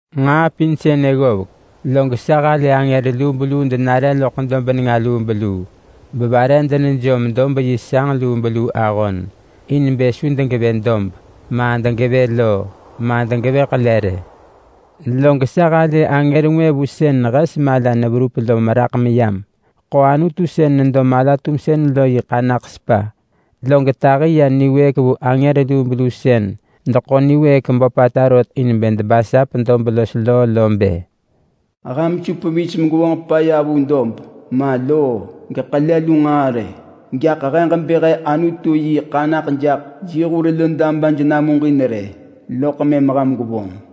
Nġaa pin sënë ggovek, log sa halë angër lubeluu denare loḳ dob nenga lubeluu, bevare denejom dob yi sanġ lubeluu ahon in bë su degevë dob, ma degevë loo, ma degevë ḳele rë. Log sa halë angër ngwë vu sën hes mala neverup lo meraḳ meyam. Ḳo Anutu sën nedo mala-tumsën lo yi ḳanaḳ sepa, log tahi ya niwëëk vu angër lubeluu sën deḳo niwëëk böpata rot in debasap dob los loo lo bë, “Ham su pevis megwevonġ paya vu dob, ma loo geḳele lu nġaa rë. Gaḳ he ġebë he Anutu yi ḳanaḳ jaḳ yi hur lo dabaj namuġin rë, loḳ mëm ham gwevonġ.”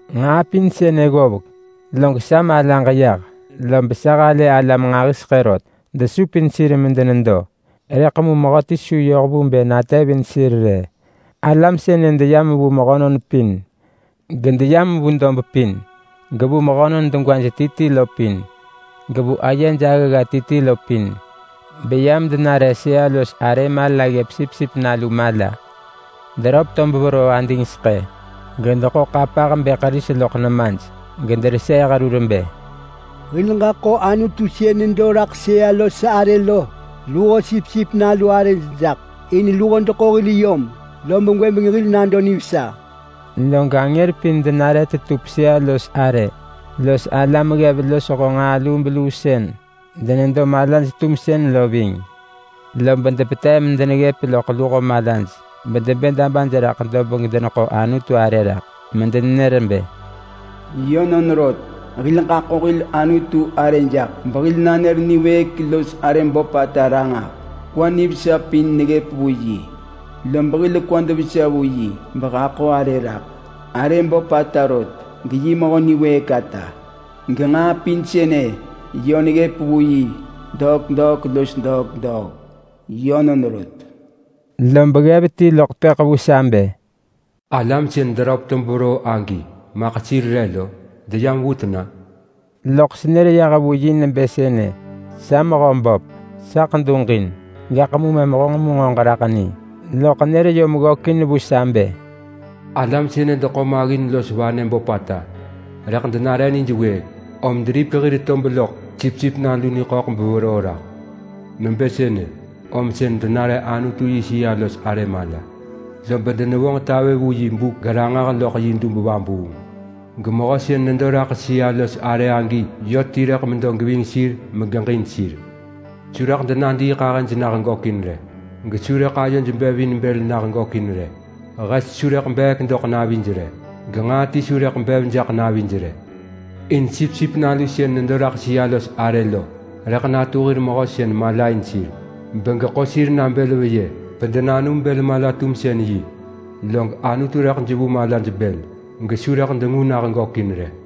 Nġaa pin sënë ggovek, log sa malaġ yah. Lob sa halë alam nġahiseḳë rot desupin sir medenedo, rëḳ mu mehöti su yoh vu bë natevin sir rë. Alam sënë deyam vu mehönon pin, gedeyam vu dob pin, gevu mehönon degwaj ti ti lo pin, gevu ayej agga ti ti lo pin. Beyam denare sëa-los-arë mala ggëp Sipsip Nalu mala. Deröp tob veroo adingseḳë, gedeḳo ḳapah bëḳ ris loḳ nemaj, gedereseeh rur bë: “Hil ġaḳo Anutu sën nedo raḳ sëa-los-arë lo luho Sipsip Nalu arëj jaḳ. In luho deḳo hil yom lob gwëbeng hil nado nivesa!” Log angër pin denare tetup sëa-los-arë los alam ggev losho nġaa lubeluu sën denedo malaj-tumsën lo ving. Lob depetev medeneggëp loḳ luho malaj bedebë dabaj raḳ dob gedeneḳo Anutu arë rak medenenër bë: “Yönon rot! Hil ġaḳo hil Anutu arë jaḳ, behil nanër niwëëk los arë böpata ranġah! Kwa nivesa pin neggëp vu yi, lob hil kwad vesa vu yi behaḳo arë raḳ! Arë böpata rot geyi Mehö niwëëk ata, genġaa pin sënë yö neggëp vu yi degwata los degwata! Yönon rot!” Lob ggev ti loḳ tepëḳ vu sa bë, “Alam sën deröp tob veroo agi maḳ sir re lo? Deyam vu tena?” Loḳ senër yah vu yi nebë sënë bë, “Sa Mehöböp, saḳ duġin. Gaḳ mu mëm honġ mu nġo ġeraḳ ni.” Loḳ nër yom ggökin vu sa bë, “Alam sënë deḳo maggin los vanë böpata rëḳ denare nij wëëk, om deripek hir tob loḳ Sipsip Nalu niḳöḳ beveroo raḳ. Nebë sënë, om sën denare Anutu yi sëa-los-arë mala. Lob denevonġ tavë vu yi buk geranġah loḳ yi dub vabuung. Gemehö sën nedo raḳ sëa-los-arë agi yö ti rëḳ medo geving sir megeġin sir. Su rëḳ denadiiḳahëj nah gökin rë, gesu rëḳ ayoj bev in bël nah gökin rë. Hes su rëḳ beek doḳ navij rë, genġaa ti su rëḳ bev jaḳ navij rë. In Sipsip Nalu sën nedo raḳ sëa-los-arë lo rëḳ natu hir mehö sën malain sir, begeḳo sir na bël veyë bedenanum bël mala-tumsën-yi. Log Anutu rëḳ jevu malaj bël, gesu rëḳ dengu nah gökin rë.”